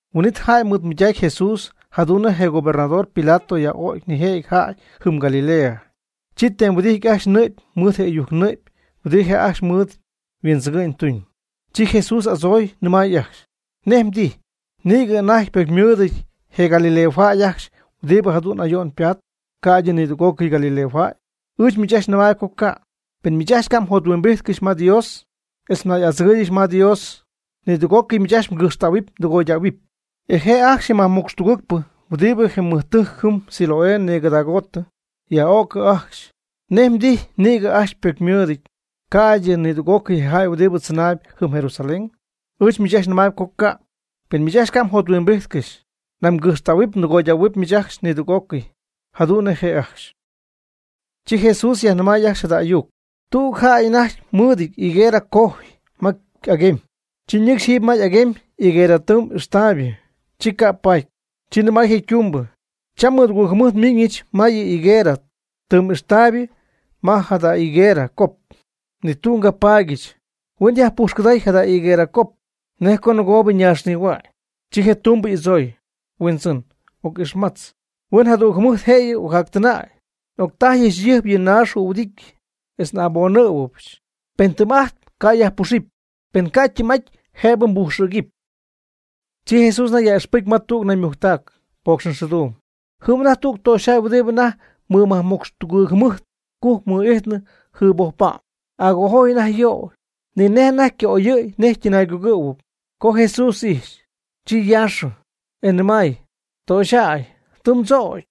Huin'it jäy mɨɨdmɨydacy Jesús jadu'n nej je gobernador Pilato yaj'ögy nijëjɨty jäy jɨm Galilea, chi tem huɨdijtɨ ajcxy ñɨ'py mɨɨd ɨyujc ñɨ'py huɨdi je' ajcxy mɨɨd huindzɨgɨ'ñ tuuñ. Chi Jesús y'adzooy nɨmay ajcxy: ―¿Nej mdijy, nïgɨ anajty ypocymɨɨdɨty je galileojäy ajcxy huɨdi jadu'n ayo'n patp, ca'ydɨ nidüg'ócɨy galileojäy? Ɨɨch miich ajcxy nɨmaayb co ca'. Pen miich ajcxy ca' mjothuimbíjtcɨxy ma Dios etz nay'adzɨgɨ́ɨyɨgɨxy ma Dios, nidüg'ocɨy miich ajcxy mgɨjxtähuɨp mdɨgoydähuɨp. E je' ajcxy je majmocxtugɨɨgpɨ huɨdi je mɨjtɨjc jɨm Siloé nïgɨdaagoottɨ, yaj'öcɨ ajcxy. ¿Nej mdijy nïgɨ ajcxy ypocymɨɨdɨty, ca'ydɨ nidüg'ócɨy je jäy huɨdi tzɨnayb jɨm Jerusalén? Ɨɨch miich ajcxy nɨmaayb co ca'. Pen miich ajcxy ca' mjothuimbijtcɨxy, nañ mgɨjxtähuɨp mdɨgoydähuɨp miich ajcxy nidüg'ócɨy, jadu'n nej je' ajcxy. Chi Jesús yajnɨmay ajcxy jada ayuc: ―Tüg jäy anajty mɨɨdɨty higuerɨ cojy ma y'aguemy, chi ñɨcxy jiiby ma y'aguemy higuerɨ tɨɨm ijxtaaybɨ, ni ca' paty. Chi nɨmay je' ytumbɨ: “Cham mɨdugɨɨg jɨmɨjt miiñɨch ya higuerɨ tɨɨm ijxtayb ma jada higuerɨ cop, ni tüg ngapaadyɨch. Huen yajpujxcɨday jada higuerɨ cop, nej co nɨgoobɨ ñaaxnihua'ñ.” Chi je' ytumbɨ y'adzooy: “Huindzɨn, oc'ixmatz. Huen jadüg jɨmɨjt jëyɨ ocjactɨnäy, octajyɨch jayɨjp yɨ naax jühuɨdityɨ, etz oc'abonɨjɨ̈yɨch. Pen tɨɨm'ajt ca' nyajpuxɨpy, pen ca' ytɨɨm'aty jëbɨ nbújxɨgɨpy.” Chi Jesús anajty yaj'ixpɨcy ma tüg naymujctac pocxxɨɨduum. Jɨm anajty tüg töxyjäy huɨdi anajty mɨmajmocxtugɨɨg jɨmɨjt cujc mɨ'ijtnɨ yjɨɨbojpa'm, agojojy anajty yöy, ni nej anajty yca'oyɨ̈y nej ytɨnaaygugɨ̈huɨpy. Co Jesús ijxy, chi yaaxɨ, e nɨmay: ―Töxyjäy, tɨ mdzögy.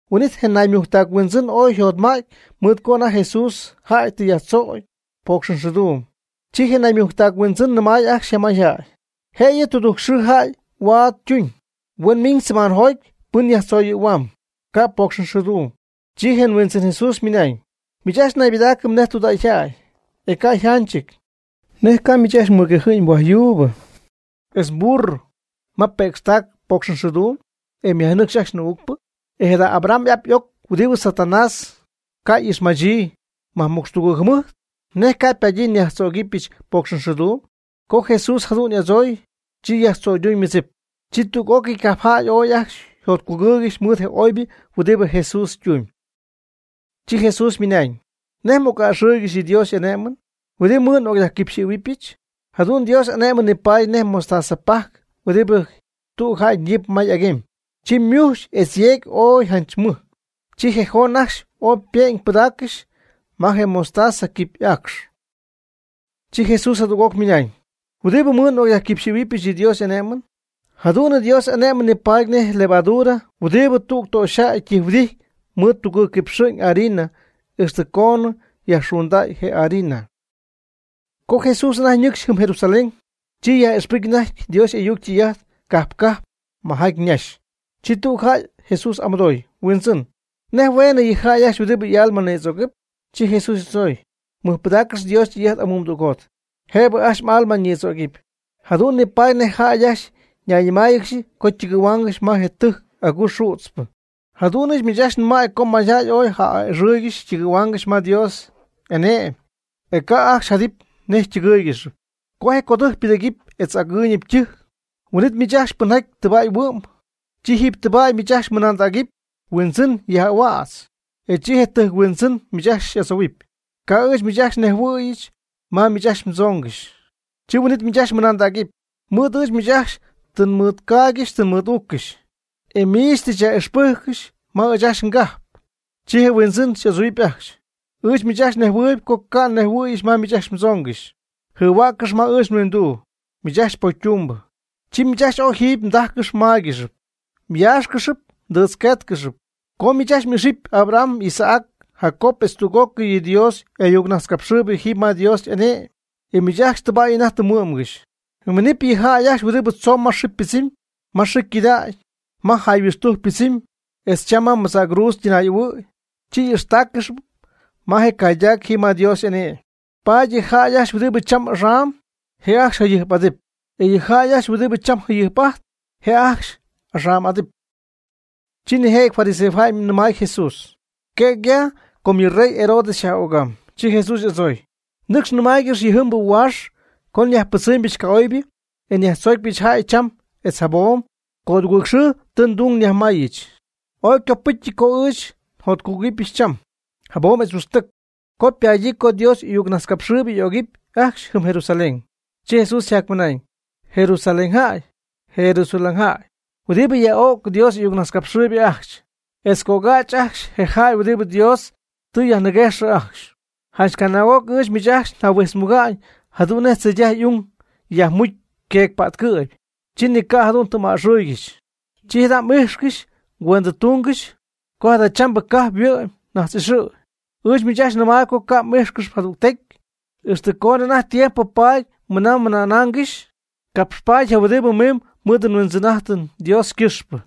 Huin'it je naymujctac huindzɨn ooy yjotmäty mɨɨd co anajty Jesús jäy tɨ tzoyɨ̈y pocxxɨɨduum. Chi je naymujctac huindzɨn nɨmay ajcxy je mayjäy: ―Jëyɨ tudujc xɨɨ jäy huaad ytuñ, huen miñ semaanjoty pɨn yajtzoyɨ̈huam, ca' ypocxxɨɨduumɨty. Chi je huindzɨn Jesús ymɨnañ: ―¡Miich ajcxy naybɨdaacɨp nej tudägyjäy, e ca' yjanchɨty! ¿Nej ca'miich ajcxy mmɨguejɨ̈y mhuajyuubɨ, etz mburro ma ypëcxtac pocxxɨɨduum, e myajnɨcxy ajcxy nɨɨ'ucpɨ? E jada Abraham y'ap y'oc huɨdi Satanás ca' y'ixmachii majmocxtugɨɨg jɨmɨjt, ¿nej ca' ypadyii nyajtzögɨbɨch pocxxɨɨduum? Co Jesús jadu'n y'adzoy, chi yajtzöyduuñ ymɨdzip. Chi tüg'ócɨy cajpjäy oy ajcxy yjotcugɨɨygɨxy mɨɨd je oybɨ huɨdi Jesús ytuun. Chi Jesús ymɨnañ: ―¿Nej m'oc'a'ɨxɨɨygɨxy yɨ Dios y'ané'mɨn? ¿Huɨdi mɨɨd n'ocyajquipxɨ̈huɨbɨch? Jadu'n Dios y'ané'mɨn nipaady nej mostaza pajc huɨdibɨ tüg jäy ñiip ma y'aguemy, chi ymujxy etz yeegy ooy janch mɨj, chi je joon ajcxy oy ype'ñ pɨdaaccɨxy ma je mostaza quipy aacxy. Chi Jesús jadüg'oc ymɨnañ: ―¿Huɨdibɨ mɨɨd n'ocyajquipxɨ̈huɨbɨch yɨ Dios y'ané'mɨn? Jadu'n Dios y'ané'mɨn ni paady nej levadura huɨdi tüg töxyjäy ytijhuɨdijt mɨɨd tugɨɨg quipxɨ'ñ harina ixtɨ coonɨ yajxunday je harina. Co Jesús anajty ñɨcxy jɨm Jerusalén, chi yaj'ixpɨcy anajty Dios y'ayuc ytɨy'ajt cajp cajp majaty ñaxy. Chi tüg jäy Jesús amɨdoy: ―Huindzɨn, ¿nej hueenɨ yɨ jäy ajcxy huɨdi y'alma nïdzögɨp? Chi Jesús y'adzooy: ―Mɨjpɨdaaccɨx Dios ytɨy'ajt amuumdügjot, jëbɨ ajcxy m'alma ñïdzögɨpy, jadu'n nipaady nej jäy ajcxy ñaymɨc'íjxɨgɨxy co ytɨgɨ̈huaangɨxy ma je tɨjc aguu xützpɨ. Jadu'n ɨɨch miich nɨmaayb co mayjäy ooy ja'a'ɨxɨ̈y ytɨgɨ̈huaangɨxy ma Dios y'ane'my e ca' ajcxy jadɨpy nej ytɨgɨ́ɨygɨxɨpy. Co je codɨjc ypɨdɨ̈gɨpy etz agɨɨyñɨp ytɨjc, huin'it miich ajcxy pɨnjaty tɨbäy huɨ'm, chi jiiby tɨbäy miich ajcxy mmɨnandägɨpy: “Huindzɨn, yaj'ahuädz”, e chi je tɨjc huindzɨn miich ajcxy xy'adzohuɨpy: “Ca' ɨɨch miich ajcxy nejhuɨ̈yɨch ma miich ajcxy mdzoongɨxy.” Chi huin'it miich ajcxy mɨnandägɨpy: “Mɨɨd ɨɨch ajcxy miich tɨ nmɨɨdgaaygɨxy tɨ nmɨɨd'uuccɨxy, e miich tɨ myaj'ixpɨcy ma ɨɨch ajcxy ngajp.” Chi je Huindzɨn y'adzohuɨpy ajcxy: “Ɨɨch miich ajcxy nɨmayb co ca' nnejhuɨ̈yɨch ma miich ajcxy mdzoongɨxy. Jɨhuäccɨx ma ɨɨch nhuinduu, miich ajcxy pocy ytumbɨ.” Chi miich ajcxy jɨm ooy mdájcɨxɨpy mmáygɨxɨpy, myáaxcɨxɨpy mdɨɨtzquéetcɨxɨpy, co miich ajcxy m'ixɨpy Abraham, Isaac, Jacob etz tüg'ócɨy yɨ Dios y'ayucnajtzcapxɨɨybɨ jiiby ma Dios y'ane'my, e miich ajcxy tɨbäy anajty tɨ mhuɨ'mgɨxy. Minɨp yɨ jäy ajcxy huɨdibɨ tzoomb ma xɨɨ ypɨdzɨmy, ma xɨɨ ycɨdägy, ma jayhuixtujc ypɨdzɨmy, etz cham ma madzäcruudz ytɨnaay'ahuɨ̈y, chi y'ixtáaccɨxɨpy ma je caydac jiiby ma Dios y'ane'my. Paady ji jäy ajcxy huɨdi cham axam'ajtp, je' ajcxy jayɨjp'adɨp, etz ji jäy ajcxy huɨdibɨ cham jayɨjp'ajtp, etz je' ajcxy axam'adɨp. Chi nijëjɨty fariseojäy nɨmay Jesús: ―Quëg ya com yɨ rey Herodes xyaj'ögaam. Chi Jesús y'adzooy: ―Nɨcx nɨmaaygɨx yɨjiibɨ huaax co nyajpɨdzɨmybɨch ca'oybɨ etz nyajtzoocypɨch jäy cham etz jabom, codugɨɨg xɨɨ tɨ ndung mayíijɨch. Ooy ycopɨcyɨty co ɨɨch njactüyöyɨbɨch cham, jabom etz huixtɨc. Com ypaadyii co Dios y'ayuccapxhuäcxpɨ y'ögɨp ajcxy jɨm Jerusalén. Chi Jesús yjacmɨnaañ: ―¡Jerusalén jáy! ¡Jerusalén jäy! huɨdibɨ yaj'o'cp Dios y'ayucnajtzcapxɨɨyb ajcxy, etz ycögädz ajcxy je jäy huɨdibɨ Dios tɨ xyajniguéjx ajcxy. Janch canaag'oc ɨɨch miich ajcxy njahuijtzmuga'ñ jadu'n nej tzeydaj y'ung yajmucy queecpätcɨ̈py, chi ni ca' jadu'n tɨ m'a'ɨxɨɨygɨxy. Chi jada' ijxcɨx cuendɨtungɨx, com jadachambɨ mgajp yhuɨ'my najtz'ixɨ'. Ɨɨch miich ajcxy nɨmayb co ca' xy'ixɨpyɨch jadügtecy, ixtɨ coonɨ anajty tiempo paaty mɨna mmɨnáangɨxɨpy: “Capxpaaty je' huɨdi miimb mɨɨd Huindzɨn'ájtɨn Dios ycɨxpɨ.”